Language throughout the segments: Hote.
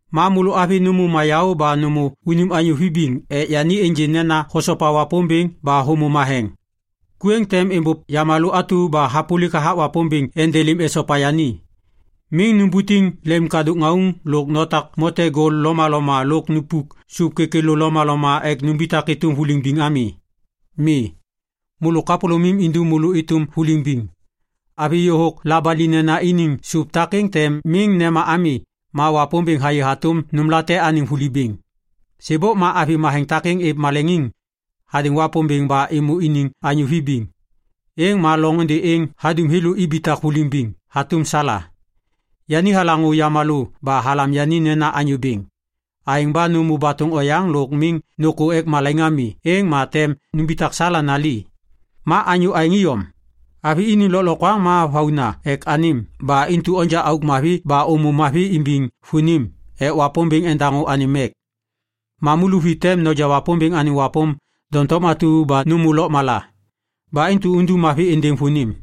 Ma môlô avi nômô mayaô ba nômô unim anyô vibiŋ ek yani ênjê nena hosopa Wapômbêŋ ba hômô matheŋ. Ku êŋ tem êmbôv yamalô atu ba hapôlik hathak Wapômbêŋ endelêm esopa yani. Miŋ nubutiŋ lemkadôk ŋauŋ lôk notak mote gol lomaloma lôk noba sôp kêkêlô lomaloma ek numbitak êtôm vuliŋ biŋ ami. Mi. Môlô kapôlômim indum môlô êtôm vuliŋ biŋ. Avi yôhôk labalinena iniŋ sôp takêŋ tem miŋ nema ami ma Wapômbêŋ hayê hatôm nômlate anêŋ vuli bêŋ. Sêbôk ma avi matheŋ takêŋ êv maleŋiŋ hadêŋ Wapômbêŋ ba êmô iniŋ anyô vibiŋ. Êŋ ma loŋôndê êŋ hadum thêlô ibitak vuliŋ biŋ hatôm Sala. Yani halaŋô yamalô ba halam yani nena anyô bêŋ. Aêŋ ba nômô batôŋ oyaŋ lôk miŋ nôkô ek malaiŋ ami, êŋ ma tem numbitak Sala nali. Ma anyô aêŋ iyom. Avi iniŋ lôklokwaŋ ma vauna ek anêm ba intu onja auk mavi ba ômô mavi imbiŋ vônim ek Wapômbêŋ endaŋô anêm mek. Mamu luvi tem noja Wapômbêŋ anêŋ wapôm doŋtom atu ba nômô lôkmala. Ba intu undum mavi êndêŋ vônim.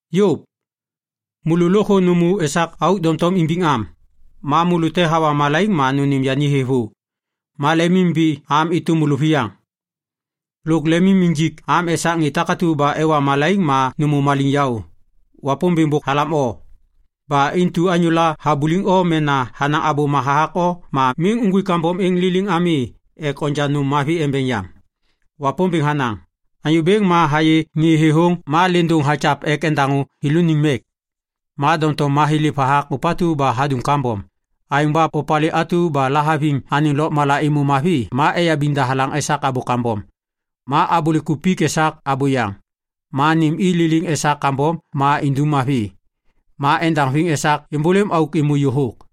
Yôv. Môlô lôkthô nômô esak auk doŋtom imbiŋ am. Ma môlô te hawa malaiŋ ma nônêm yani thêvô. Ma lemimimbiŋ am êtôm môlôviyaŋ. Lôk lemim injik am esak ŋê takatu ba ewa malaiŋ ma nômô maliŋyaô. Wapômbêŋ bôk halam o. Ba intu anyôla habuliŋ o mena hanaŋ abôma hathak o ma miŋ nuŋgwik kambom êŋ liliŋ ami ek onja nôm mavi embeŋ yam. Wapômbêŋ hanaŋ, “Anyô Bêŋ ma hayê ŋê thêthôŋ ma lêndôŋ hakyav ek endaŋô thêlôniŋ mek. Ma doŋtom mathêlêv hathak ôpatu ba hadum kambom. Aêŋ ba opalê atu ba lahaviŋ anêŋ lôkmala êmô mavi, ma eyabiŋ dahalaŋ esak abô kambom ma abôlêk kupik esak abôyaŋ. Ma nêm i liliŋ esak kambom ma indum mavi. Ma endaŋviŋ esak êmbôlêm auk êmô yôhôk.”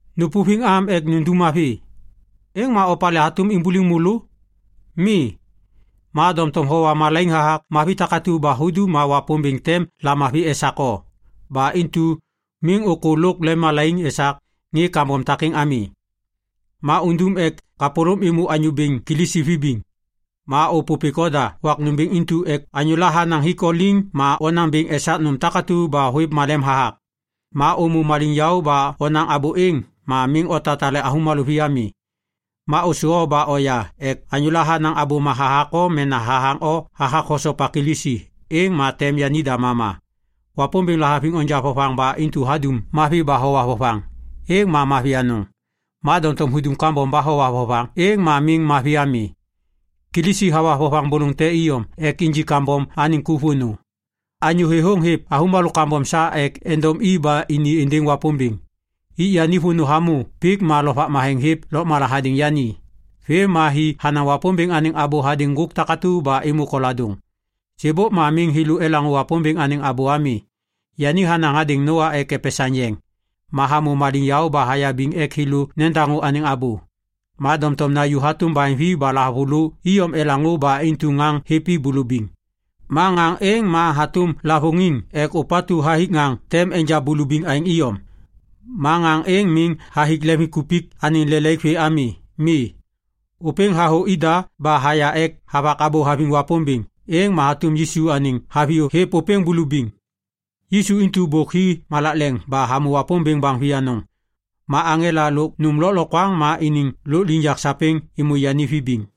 Nôpôviŋ am ek nundum mavi, êŋ ma opalê hatôm imbuliŋ môlô? Mi. Ma doŋtom howa malaiŋ hathak mavi takatu ba hudum ma Wapômbêŋ tem lamavi esak o. Ba intu “miŋ ôkô lôk lemmalaiŋ esak ŋê kambom takêŋ ami.” Ma undum ek kapôlôm êmô Anyô Bêŋ Kilisi vibiŋ. Ma ôpôpêk oda wak nômbêŋ intu ek anyôla hanaŋ hik o liŋ ma onaŋ bêŋ esak nôm takatu ba hôêv malem hathak. Ma ômô maliŋyaô ba onaŋ abô êŋ ma miŋ otatale avômalô vi ami. Ma ôsô o ba oya ek anyôla hanaŋ abôma hathak o mena hathaŋ o hathak hosopa Kilisi, êŋ ma tem yanida mama. Wapômbêŋ lahaviŋ onja vovaŋ ba intu hudum mavi ba howa vovaŋ, êŋ ma mavi anôŋ. Ma doŋtom hudum kambom ba howa vovaŋ, êŋ ma miŋ mavi ami. Kilisi hawa vovaŋ bôlôŋ te iyom ek injik kambom anêŋ ku vônô. Anyô thêthôŋ hêv avômalô kambom sa ek endom i ba ini êndêŋ Wapômbêŋ. Ik yani vônô hamô pik ma Lovak Matheŋ hêv lôkmala hadêŋ yani. Vêm ma hi hanaŋ Wapômbêŋ anêŋ abô hadêŋ ŋgôk takatu ba êmô koladôŋ. Sêbôk ma miŋ thêlô elaŋô Wapômbêŋ anêŋ abô ami. Yani hanaŋ hadêŋ Noa ek epesaŋ yeŋ. Ma hamô maliŋyaô ba hayabiŋ ek thêlô nedaŋô anêŋ abô. Ma doŋtom naju hatôm baheŋvi ba lahavulô iyom elaŋô ba intu ŋaŋ hêv i bulubiŋ. Ma ŋaŋ êŋ ma hatôm lavôŋiŋ ek ôpatu hathik ŋaŋ tem enja bulubiŋ aêŋ iyom. Ma ŋaŋ êŋ miŋ hathik leŋviŋkupik anêŋ lelaik vê ami. Mi. Ôpêŋ hathô ida ba haya ek havak abô haviŋ Wapômbêŋ. Êŋ ma hatôm Yisu anêŋ haviyô hêv ôpêŋ bulubiŋ. Yisu intu bôk hi malak leŋ ba hamô Wapômbêŋ baŋ vi anôŋ. Ma aŋela lôk nôm lôklokwaŋ ma iniŋ lôkliŋyak sapêŋ êmô yani vibiŋ.